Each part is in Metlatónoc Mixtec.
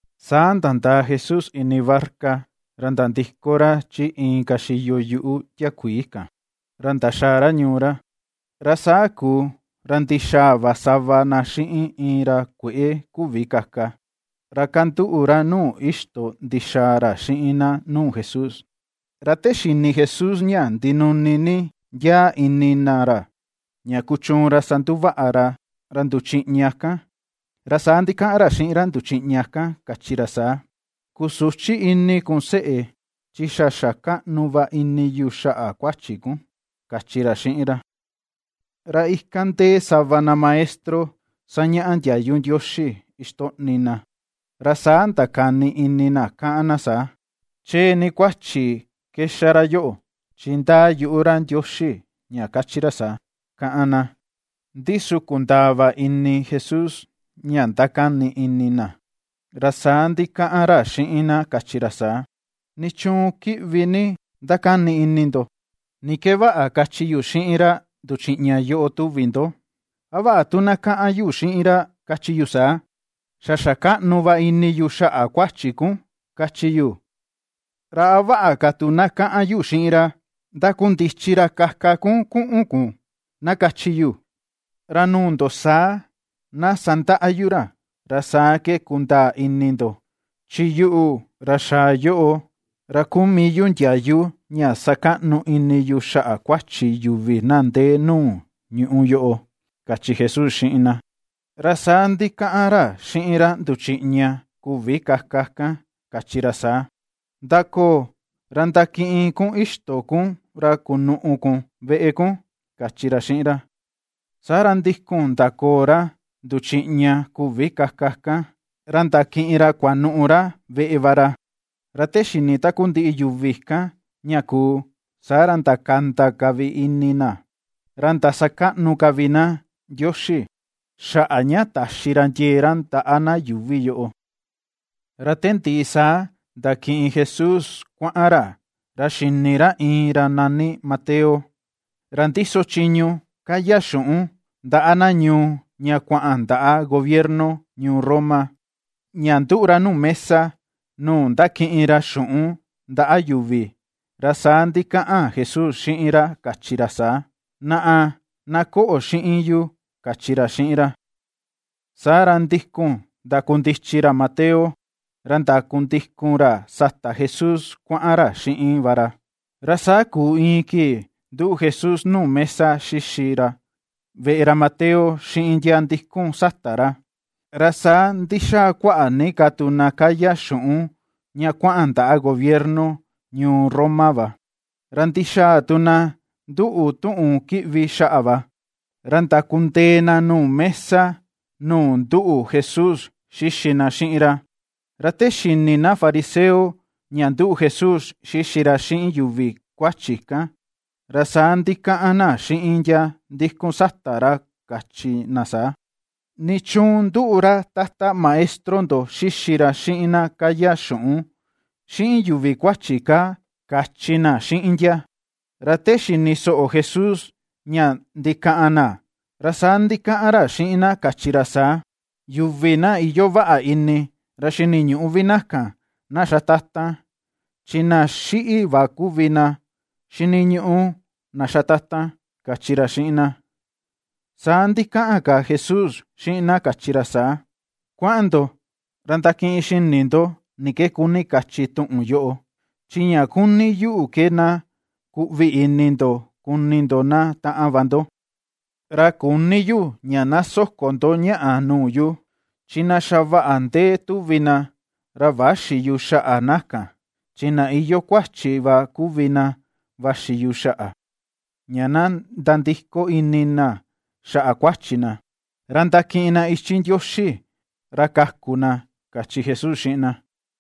Saa nandaa Jesús ini barca, ra nandiko ra chi inka xiyo yuꞌu tiakuii kan, ra ndaxaa ra ñuu ra. Ra saa kuu, ra ndixaa va sava na xiꞌin iin ra kueꞌe küvi kaka, ra kanduꞌu ra nuu ixto ndixaa ra xiꞌin na nuu Jesús. Ra te xini Jesús ña ndinuni ni ndiaa ini na ra, ña kuchuun ra sanduvaꞌa ra ra nduchiꞌña kan, ra saa ndikaꞌan ra xiꞌin ra nduchiꞌña kan kachi ra saa: ―Kusüchi ini kun seꞌe, chi xa xa kaꞌnu va ini yu xaꞌa kuachi kun ―kachi ra xiꞌin ra. Ra ikan ndee sava na maestro sañaꞌa ndiayu Ndioxi ixtoꞌni na, ra saa ndakani ini na kaꞌan na saa: “Chee ni kuachi ke xa ra yoꞌo chi ndaa yuꞌu ra Ndioxi ña kachi ra saa”, kaꞌan na. Ndi su kundaa va ini Jesús ña ndakani ini na, ra saa ndikaꞌan ra xiꞌin na kachi ra saa: ―¿Nichuun kiꞌvi ni ndakani ini ndo? ¿Ni ke vaꞌa kachi yu xiꞌin ra nduchiꞌña yoꞌo tuvi ndo, a vaꞌa tu na kaꞌan yu xiꞌin ra kachi yu saa: “Xa xa kaꞌnu va ini yu xaꞌa kuachi kun”, kachi yu, ra a vaꞌa ka tu na kaꞌan yu xiꞌin ra: “Ndakundichi ra kaka kun kuꞌun kun”, na kachi yu? Ra nuu ndo saa na sandaꞌa yu ra, ra saa ke kundaa ini ndo chi yuꞌu, ra xaa yoꞌo, ra kuu mii yu ndiayu ña sakaꞌnu ini yu xaꞌa kuachi yuvi na ndee nuu ñuꞌu yoꞌo ―kachi Jesús xiꞌin na. Ra saa ndikaꞌan ra xiꞌin ra nduchiꞌña küvi kaka kan kachi ra saa: ―Ndakoo, ra ndakiꞌin kun ixto kun ra kunuꞌu kun veꞌe kun ―kachi ra xiꞌin ra. Saa ra ndikun ndakoo ra nduchiꞌña küvi kaka kan ra ndakiꞌin ra kuanuꞌu ra veꞌe va ra. Ra te xini takundiꞌi yuvi kan ña kuu, saa ra ndakanda ka vi ini na, ra ndasakaꞌnu ka vi na Ndioxi, xaꞌa ña taxi ra ndiee ra ndaꞌa na yuuvi yoꞌo. Ra te ndiꞌi saa ndakiꞌin Jesús kuaꞌan ra, ra xini ra iin ra nani Mateo, ra ndiso chiñu kaya xuꞌun ndaꞌa na ñuu ña kuaꞌan ndaꞌa gobierno ñuu Roma. Ña nduꞌu ra nuu mesa nuu ndakiꞌin ra xuꞌun ndaꞌa yuvi, ra saa ndikaꞌan Jesús xiꞌin ra kachi ra saa: ―Naꞌa, na koꞌo xiꞌin yu ―kachi ra xiꞌin ra. Saa ra ndikun ndakundichi ra Mateo, ra ndakundikun ra sata Jesús kuaꞌan ra xiꞌin va ra. Ra saa kuu iin kii nduꞌu Jesús nuu mesa xixi ra veꞌe ra Mateo xiꞌin ndia ndikun sata ra, ra saa ndixaa kuaꞌa ni ka tu na kaya xuꞌun ña kuaꞌan ndaꞌa gobierno ñuu Roma va, ra ndixaa tu na nduꞌu tuꞌun kiꞌvi xaꞌa va, ra ndakundee na nuu mesa nuu nduꞌu Jesús xixi na xiꞌin ra. Ra te xini na fariseo ña nduꞌu Jesús xixi ra xiꞌin yuvi kuachi kan, ra saa ndikaꞌan na xiꞌin ndia ndikun sata ra kachi na saa: ―¿Nichuun nduꞌu ra Tata Maestro ndo xixi ra xiꞌin na kaya xuꞌun, xiꞌin yuvi kuachi kaa? ―kachi na xiꞌin ndia. Ra ta xini soꞌo Jesús ña ndikaꞌan na, ra saa ndikaꞌan ra xiꞌin na kachi ra saa: ―Yuvi na iyoo vaꞌa ini ra xiniñüꞌu vi na kan na xa tatan, chi na xiꞌi va kuvi na xiniñuꞌu na xa tatan ―kachi ra xiꞌin na. Saa ndikaꞌan ka Jesús xiꞌin na kachi ra saa: ―Kuaꞌan ndo ra ndakiꞌin xini ndo ni ke kuni kachi tuꞌun yoꞌo: “Chi ña kuni yu ke na kuꞌvi ni ini ndo kuni ndo na taꞌan va ndo, ra küni yu ña na soko ndo ñaꞌa nuu yu”, chi na xa vaꞌa ni ndee tuvi na, ra växi yu xaꞌa na kan, chi na iyoo kuachi va kuvi na vaxi yu xaꞌa, ña na nandiko ini na xaꞌa kuachi na, ra ndakiꞌin na ichi Ndioxi ra kaku na ―kachi Jesús xiꞌin na.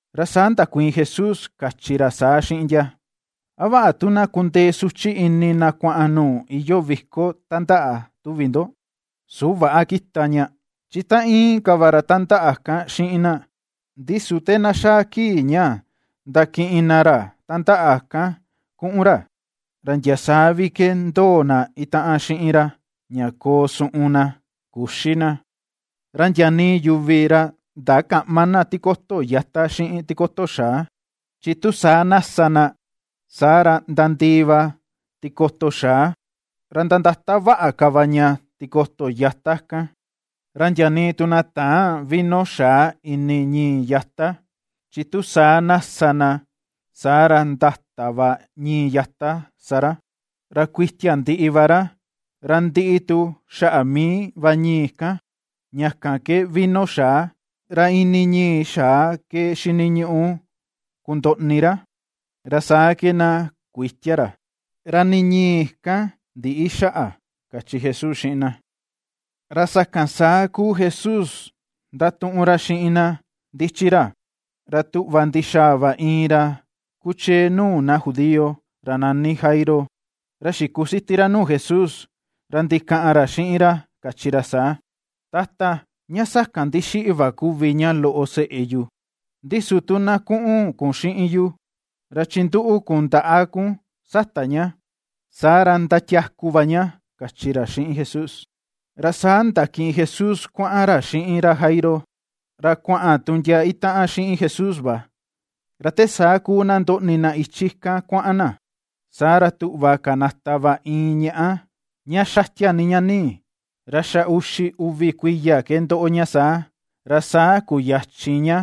Ra saa ndakuiin Jesús kachi ra saa xiꞌin ndia: ―¿A vaꞌa tu na kundee suchi ini na kuaꞌan nuu iyoo viko tandaꞌa, tuvi ndo? ¿Su väꞌa kita ña, chi tan íin ka va ra tandaꞌa kan xiꞌin na? Ndi su te na xaa kii ña ndakiꞌin na ra tandaꞌa kan kuꞌun ra, ra ndia saa vi ke ndoo na itaꞌan xiꞌin ra, ña koo suꞌun na, küxi na. Ra ndia nii yuvi ra ndakäꞌma na tikoto yata xiꞌin tikoto xaa, chi tu saa na sa na, saa ra nandii va tikoto xaa, ra nandata vaꞌa ka va ña tikoto yata kan. Ra ndia nii tu na täân vino xaa ini ñii yata, chi tu saa na sa na, saa ra ndata va ñii yata sa ra, ra kuitia ndiꞌi va ra, ra ndiꞌi tu xaꞌa mii va ñii kan, ña kan ke vino xaa, ra ini ñii xaa ke xiniñuꞌu kundoꞌni ra, ra saa ke na kuïtia ra, ra nii ñii kan ndïꞌi xaꞌa ―kachi Jesús xiꞌin na. Ra sakan saa kuu Jesús ndatuꞌun ra xiꞌin na ndichi ra, ra tuꞌva ndixaa va iin ra kuchee nuu na Judío, ra nani Jairo, ra xikusiti ra nuu Jesús ra ndikaꞌan ra xiꞌin ra, kachi ra saa: ―Tata, ña sakan ndixiꞌi va kuvi ña loꞌo seꞌe yu, ndi su tu na kuꞌun kun xiꞌin yu, ra chinduꞌu kun ndaꞌa kun sata ña, saa ra ndatiaku va ña ―kachi ra xiꞌin Jesús. Ra saa ndakiꞌin Jesús kuaꞌan ra xiꞌin ra Jairo, ra kuaꞌan tu ndia itaꞌan xiꞌin Jesús va. Ra te saa kuu na ndoꞌni na ichi kan kuaꞌan na, saa ra tuꞌva kanata va iin ñaꞌá, ña xatia ni ña nii, ra xa uxi uvi kuiya ke ndoꞌo ña saa, ra saa kuyachin ña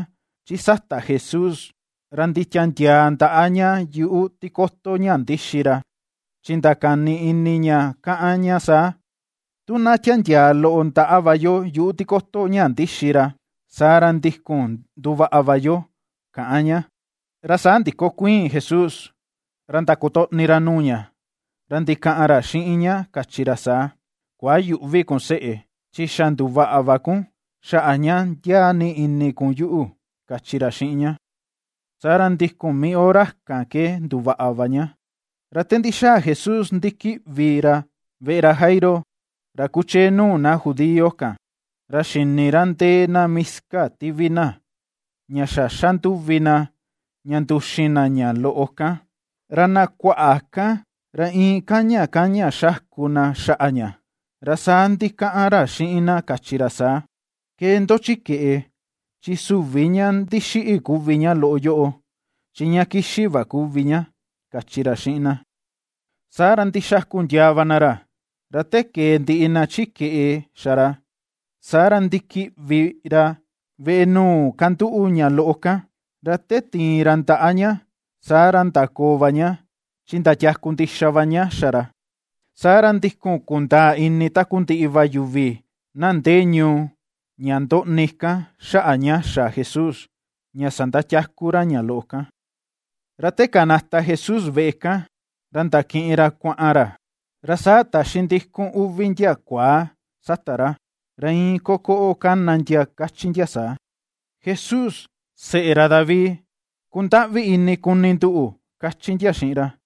chi sata Jesús ra nditiandiaa ndaꞌa ña yuꞌu tikoto ña ndixi ra. Chi ndakani ini ña káꞌan ña saa: “Tu na tiandiaa loꞌo ndaꞌa va yo yuꞌu tikoto ña ndixi ra, saa ra ndikun nduvaꞌa va yo”, kaꞌan ña. Ra saa ndikokuiin Jesús, ra ndakotoꞌni ra nuu ña, ra ndikaꞌan ra xiꞌin ña kachi ra saa: ―Kuayüꞌvi kun seꞌe, chi xa nduvaꞌa va kun, xaꞌa ña ndiaa ini kun yuꞌu ―kachi ra xiꞌin ña. Saa ra ndikun mii hora kan ke nduvaꞌa va ña. Ra te ndixaa Jesús ndikiꞌvi ra veꞌe ra Jairo, ra kuchee nuu na Judío kan, ra xini ra ndee na miska tivi na, ña xa xandúvi na, ña nduxin na ña loꞌo kan, ra na kuaꞌa kan ra iin kaña kaña xaku na xaꞌa ña. Ra saa ndikaꞌan ra xiꞌin na, kachi ra saa: ―Kee ndo chi keꞌe, chi süvi ña ndixiꞌi kuvi ña loꞌo yoꞌo, chi ña kixi va kuvi ña ―kachi ra xiꞌin na. Saa ra ndixaku ndiaa va na ra. Ra te kee ndiꞌi na chi keꞌe xa ra, saa ra ndikiꞌvi ra veꞌe nuu kanduꞌu ña loꞌo kan, ra te tiin ra ndaꞌa ña, saa ra ndakoo va ña, chi ndatiaku ndixa va ña xa ra. Saa ra ndikun kundaa ini takundiꞌi va yuvi, na ndee ñuu ña ndoꞌni kan xaꞌa ña xa Jesús, ña sandatiaku ra ña loꞌo kan. Ra te kanata Jesús veꞌe kan, ra ndakiꞌin ra kuaꞌan ra, ra saa taxi ndikun uvi ndia kuaa sata ra, ra iin ko koꞌo kana ndia kachi ndia saa: ―Jesús, seꞌe ra David, kundaꞌvi ini kuni nduꞌu ―kachi ndia xiꞌin ra.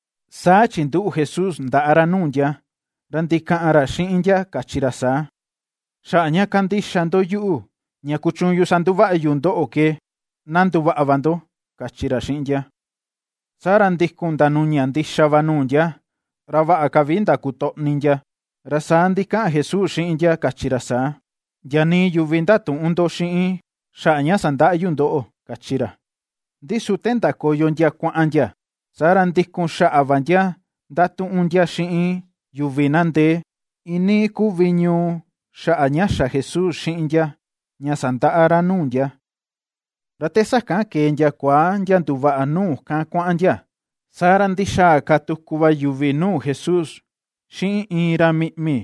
Saa chinduꞌu Jesús ndaꞌa ra nuu ndia, ra ndikaꞌan ra xiꞌin ndia kachi ra saa: ―Xaꞌa ña kandixa ndo yuꞌu, ña kuchuun yu sanduvaꞌa yu ndoꞌo ke, na nduvaꞌa va ndo ―kachi ra xiꞌin ndia. Saa ra ndikun ndanuña ndixa va nuu ndia, ra vaꞌa ka vi ndakotoꞌni ndia, ra saa ndikaꞌan Jesús xiꞌin ndia kachi ra saa: ―Ndia nii yuvi ndatüꞌun ndo xiꞌin xaꞌa ña sandaꞌa yu ndoꞌo ―kachi ra. Ndi su te ndakoyo ndia kuaꞌan ndia, saa ra ndikun xaꞌa va ndia ndatuꞌun ndia xiꞌin yuvi na ndee, iin nii kuvi ñuu xaꞌa ña xa Jesús xiꞌin ndia, ña sandaꞌa ra nuu ndia. Ra te sakan kee ndia kuaa ndia nduvaꞌa nuu kan kuaꞌan ndia, saa ra ndixaa ka tuku va yuvi nuu Jesús xiꞌin iin ra miꞌmi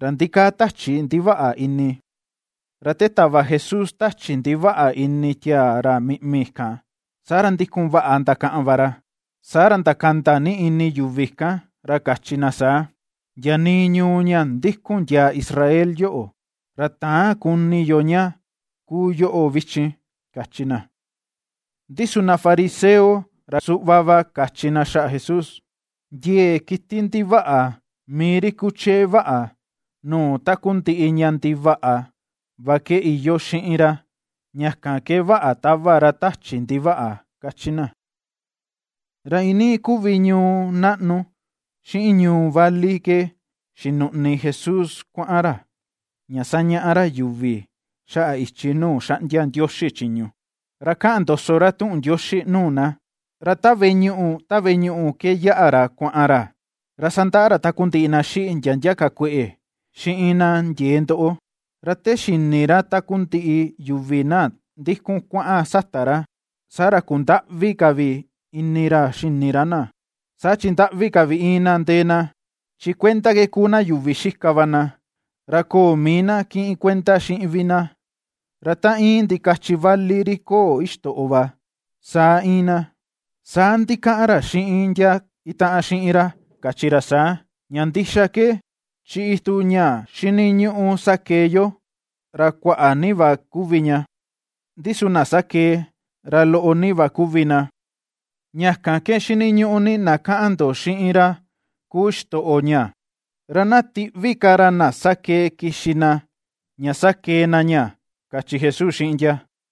ra ndikaa tachi ndivaꞌa ini. Ra te tava Jesús tachi ndivaꞌa ini tiaa ra miꞌmi kan, saa ra ndikun vaꞌa ndakaꞌan va ra. Saa ra ndakanda ni ini yuvi kan ra kachi na saa: ―Ndia nii ñuu ña ndikun ndiaa Israel yoꞌo, ra täan kuni yo ña ^kuu yoꞌo vichin ―kachi na. Ndi su ndia fariseo, ra suꞌva va, kachi ndia xaꞌa Jesús: ―Ndiee kiti ndivaꞌa, mii ri kuchee vaꞌa nuu takundiꞌi ña ndivaꞌa va ke iyoo xiꞌin ra; ña kan ke vaꞌa tava ra tachi ndivaꞌa ―kachi ndia. Ra iinii kuvi ñuu naꞌnu, xiꞌin ñuu vali ke ^xinuꞌni Jesús kuaꞌan ra, ña sañaꞌa ra yuvi xaꞌa ichi nuu xaꞌndia Ndioxi chiñu, ra kaꞌan ndoso ra tuꞌun Ndioxi nuu na, ra ta veꞌe ñuꞌu ta veꞌe ñuꞌu ke yaꞌa ra kuaꞌan ra; ra sandaꞌa ra takundiꞌi na xiꞌi ndia ndia ka kueꞌe, xiꞌin na ndiee ndoꞌo. Ra te xini ra takundiꞌi yuvi na ndikun kuaꞌan sata ra, saa ra kundaꞌvi ka vi ini ra xini ra na, saa chi ndaꞌvi ka vi íin na ndee na, chi kuenda ke kuu na yuvi xika va na, ra köo mii na kiꞌin kuenda xiꞌin vi na, ra ta íin ndikachi vali ri köo ixtoꞌo va, saa íin na. Saa ndikaꞌan ra xiꞌin ndia itaꞌan xiꞌin ra kachi ra saa: ―Ña ndixa ke, chi itu ña xiniñuꞌu sakee yo, ra kuaꞌa ni va kuvi ña, ndi su na sakee, ra loꞌo ni va kuvi na. Ña kan ke xiniñuꞌu ni na kaꞌan ndo xiꞌin ra kuu xitoꞌo ña, ra na tiꞌvi ka ra na sakee kixi na, ña sakee na ña ―kachi Jesús xiꞌin ndia.